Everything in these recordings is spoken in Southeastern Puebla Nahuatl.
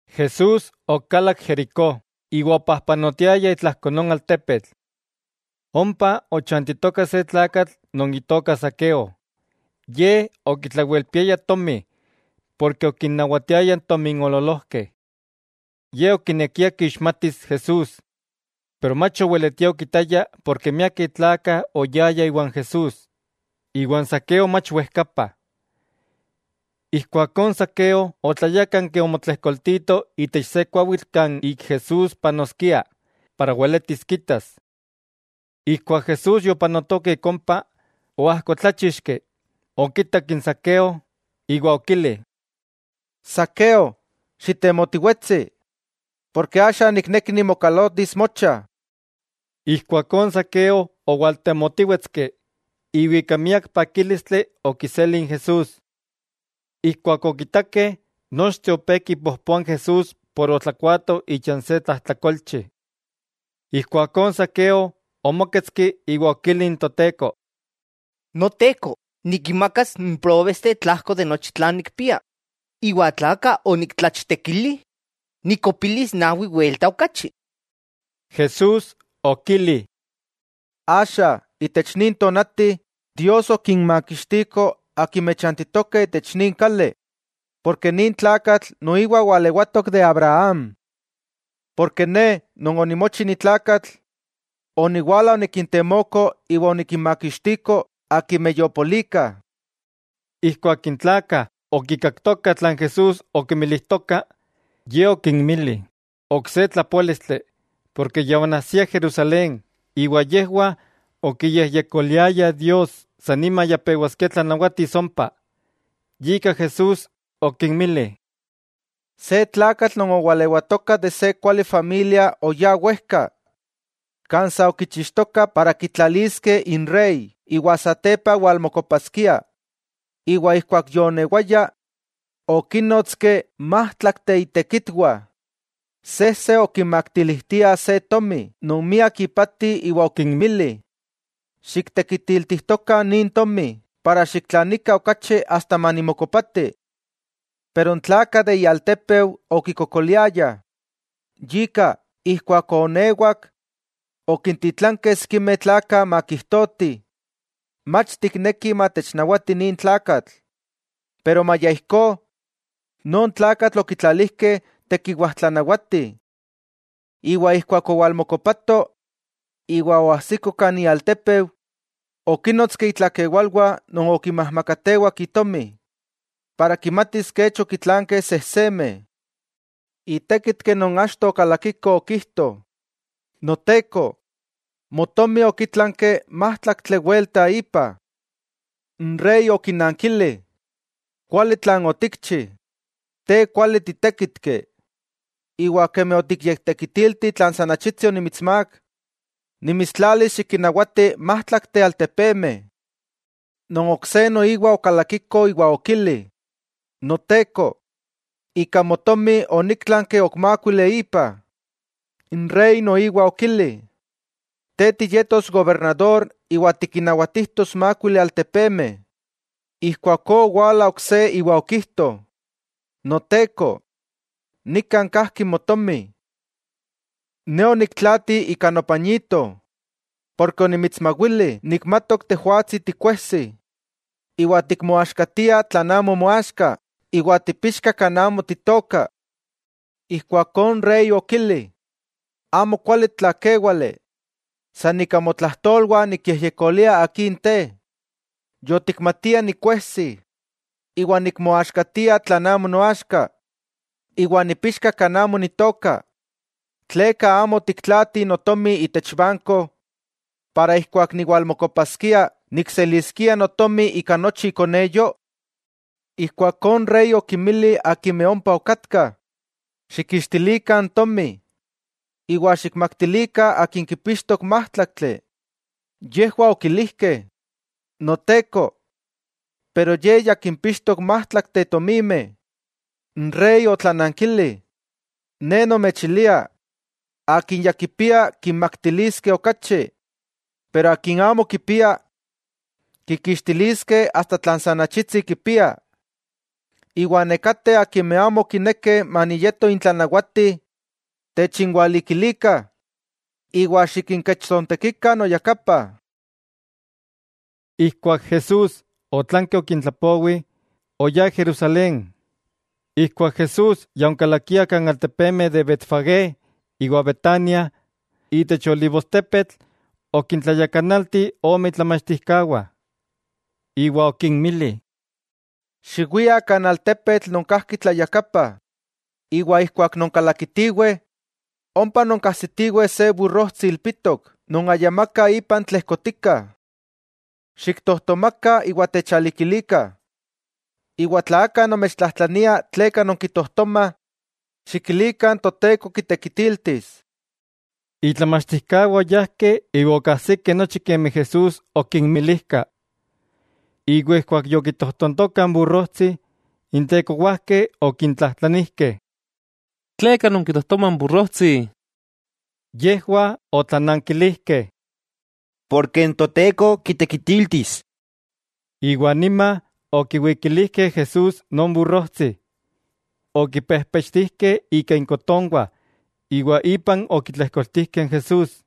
Jesús okalak Jericó, iwa opajpanotiaya itlajko non altepetl. Ompa ochantitoka se tlakatl non itoka Zaqueo ye okitlawelpiaya tomi porke okinnawatiaya n tominoololojkeh. Ye okinekia kixmatis Jesús. Pero mach oweletia okitaya porke miakeh tlakah oyayah iwan Jesús, iwa n Zaqueo mach wejkapa. Ijkuakó n Zaqueo otlayákanki omotlejkoltito itech se kuawitl kan ik Jesús panoskia para weletis kitas. Ijkuak Jesús yopanotoka ik ompa, oajkotláchixki; okitak n Zaqueo iwa okili: —Zaqueo, xitemotiwetsi, porke axa nikneki nimokalotis mocha. Ijkuakó n Zaqueo owaltemotíwetski, iwa ika miak pakílistli okiseli n Jesús. Ijkuak okitakeh, nochteh opé kipojpoah n Jesús por otlakuaato icha n se tlajtlakolchi. Ijkuakó Zaqueo omóketski iwa okili n Toteko: —Noteko, nikinmakas n próbesteh tlajko de nochi tlan nikpia; iwa tla aka oniktlachtekili, nikkopilis nawi welta okachi. Jesús okili: —Axa, itech nin tonati, Dios okinmakixtiko akimeh chantitokeh itech nin kali, porke nin tlakatl noiwa walewatok de Abraham. Ne Non onimochi ni tlakatl oniwala onikintemoko iwa onikinmakixtiko akimeh yopolikah. Ijkuak n tlakah okikaktokah tlan Jesús okinmilijtoka, Ye okinmili ok se tlapoálistli, porke ya onajsia Jerusalén, iwa yejwah okiyejyekoliayah Dios san nima ya pewaskia tlanawatis ompa. Yika Jesús okinmili: —Se tlakatl non owalewatoka itech se kuali familia oyá wejka, kan sa okichixtoka kitlaliskeh inrey iwa satepa walmokopaskia. Iwa ijkuak yoonewaya, okínnotski májtlakteh itekitwah. Sejse okimaktilijtia se tomi non miak ipati iwa okinmili: “Xiktekitiltijtokah nin tomi para xiktlanikah okachi asta manimokopati.” Pero n tlakah de ialtépeu okikokoliayah, yika, ijkuak oonewak, okintitlankeh sikimeh tlakah makijtotih: “Mach tiknekih matechnawati nin tlakatl.” Pero maya ijkó, non tlakatl okitlalijkeh tekiwajtlanawati. Iwa ijkuak owalmokopato iwa oajsiko kan ialtépeu, okínnotski itlakewalwah non okinmajmakatewak itomi, para kimatis kech okitlankeh sejsemeh. Itékitki non achto okalakiko okijto: “Noteko, motomi okitlanki májtlaktli welta ipa.” N rey okinankili: “Kuali tlan otikchi; te kuali titékitki; iwa kemi otikyektekitilti tlan san achitsi onimitsmák, nimitstlalis xikinnawati májtlakteh altepemeh.” Non ok se noiwa okalakiko iwa okili: “Noteko, ika motomi oníktlanki ok mákuili ipa.” N rey noiwa okili: “Te tiyetos gobernador iwa tikinnawatijtos mákuili altepemeh.” Ijkuakó owala ok se iwa okijto: “Noteko, nikan kajki motomi. Ne oniktlaati ika nopañito; porke onimitsmawili, nikmatok tejwatsi tikuejsi, iwa tikmoaxkatia tlan amo moaxka, iwa tipixka kan amo titooka.” Ijkuakó n rey okili: “Amo kuali tlakéwale, san ika motlajtolwah nikyejyekolia akin te. Yotikmatia nikuejsi, iwa nikmoaxkatia tlan amo noaxka, iwa nipixka kan amo nitooka. ¿Tleka amo otiktlaati notomi itech banko, ijkó keman niwalmokopaskia, nikseliskia notomi ika nochi ikoneyo?” Ijkuakó n rey okinmili akimeh ompa okatkah: “Xikkixtilikah n tomi, iwa xikmaktilikah akin kipixtok májtlaktli.” Yejwah okilijkeh: “Noteko, pero ye ya kimpixtok májtlakteh tomimeh.” N rey otlanankili: “Ne nomechilia, akin ya kipia, kimaktiliskeh okachi. Iwa akin amo kipia, kikixtiliskeh asta tlan san achitsi kipia. Iwa nekateh akimeh amo okinekeh maniyeto intlanawati, techinwalikilikah iwa xikinkechtsontekikah noyakapa.” Ijkuak Jesús otlanki okintlapowi, oyá Jerusalén. Ijkuak Jesús ya onkalakia kan altepemeh de Betfagé iwa Betania, itech olivostepetl, okintlayakanalti ome itlamachtijkawah, iwa okinmili: —Xiwiah kan altepetl non kajki tlayakapa, iwa ijkuak nonkalakitiweh, ompa nonkajsitiweh se burrojtsi ilpitok, non ayamaka ipan tlejkotika. Xiktojtomakah iwa techalikilikah. Iwa tla aka nomechtlajtlania tleka nonkitojtomah, xikilikah n Toteko kitekitiltis. Itlamachtijkawah oyajkeh iwa okajsikeh nochi kemi Jesús okinmilijka. Iwa ijkuak yokitojtontokah n burrojtsi, n tekowajkeh okintlajtlanijkeh: —¿Tleka nonkitojtomah n burrojtsi? Yejwah otlanankilijkeh: —Porke n Toteko kitekitiltis. Iwa nima, okiwikilijkeh n Jesús non burrojtsi, okipejpechtijkeh ika inkotonwah iwa ipan okitlejkoltijkeh n Jesús.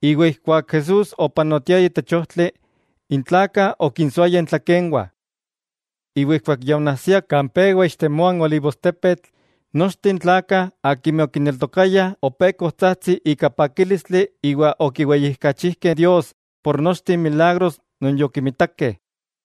Iwa ijkuak Jesús opanotiaya itech ojtli, n tlakah okinsoayah intlakenwah. Iwa ijkuak ya onajsia kan pewa ixtemoa n olivostepetl, nochteh n tlakah akimeh okineltokayah opé kojtsajtsih ika pakílistli iwa okiweyijkachijkeh Dios por nochteh n milagros non yokimitakeh.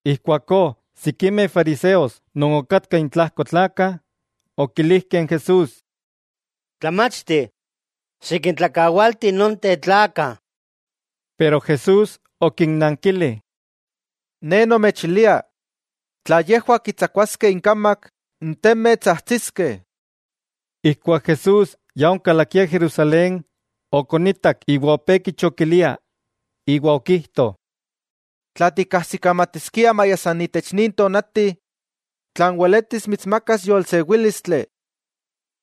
Ijkuakó sikimeh fariseos non okatkah intlajko n tlakah, okilijkeh n Jesús: —Tlamachti, xikintlakawalti nonteh tlakah. Pero Jesús okinnankili: —Ne nomechilia, tla yejwah kitsakuaskeh inkamak, n temeh tsajtsiskeh. Ijkuak Jesús ya onkalakia Jerusalén, okonitak iwa opé kichokilia. Iwa okijto: —¡Tla tikkajsikamatiskia maya san itech nin tonati, tlan weletis mitsmakas yolsewílistli!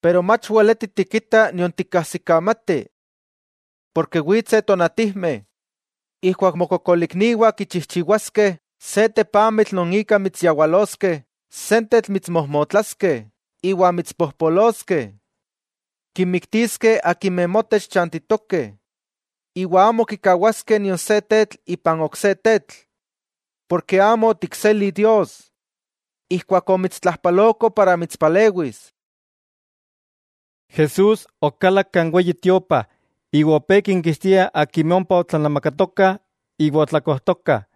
Pero mach weleti tikita nion tikkajsikamati. Porke witseh tonatijmeh, ijkuak mokokolikniwah kichijchiwaskeh se tepamitl non ika mitsyawaloskeh, sentetl mitsmojmotlaskeh iwa mitspojpoloskeh. Kinmiktiskeh non motech chantitokeh, iwa amo kikawaskeh nion se tetl ipan ok se tetl, porke amo otikseli Dios, ijkuak omitstlajpaloko para mitspalewis. Jesús okalak kan Weyi Tiopa iwa opé kinkixtia akimeh ompa otlanamakatokah iwa otlakojtokah,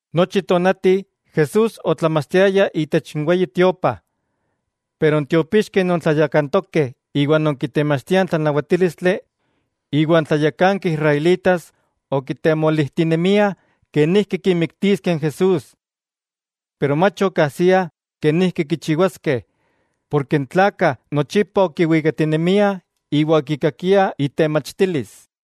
Nochi tonati Jesús otlamachtiaya itech Weyi Tiopa, pero n tiopixkeh non tlayakantokeh iwa non kitemachtiah n tlanawatílistli, iwa n tlayakankeh israelitas, okitemolijtinemiah kenijki kimiktiskeh n Jesús. Pero mach okajsiah kenijki kichiwaskeh, porke n tlakah nochipa okiwikatinemiah iwa okikakiah itemachtilis.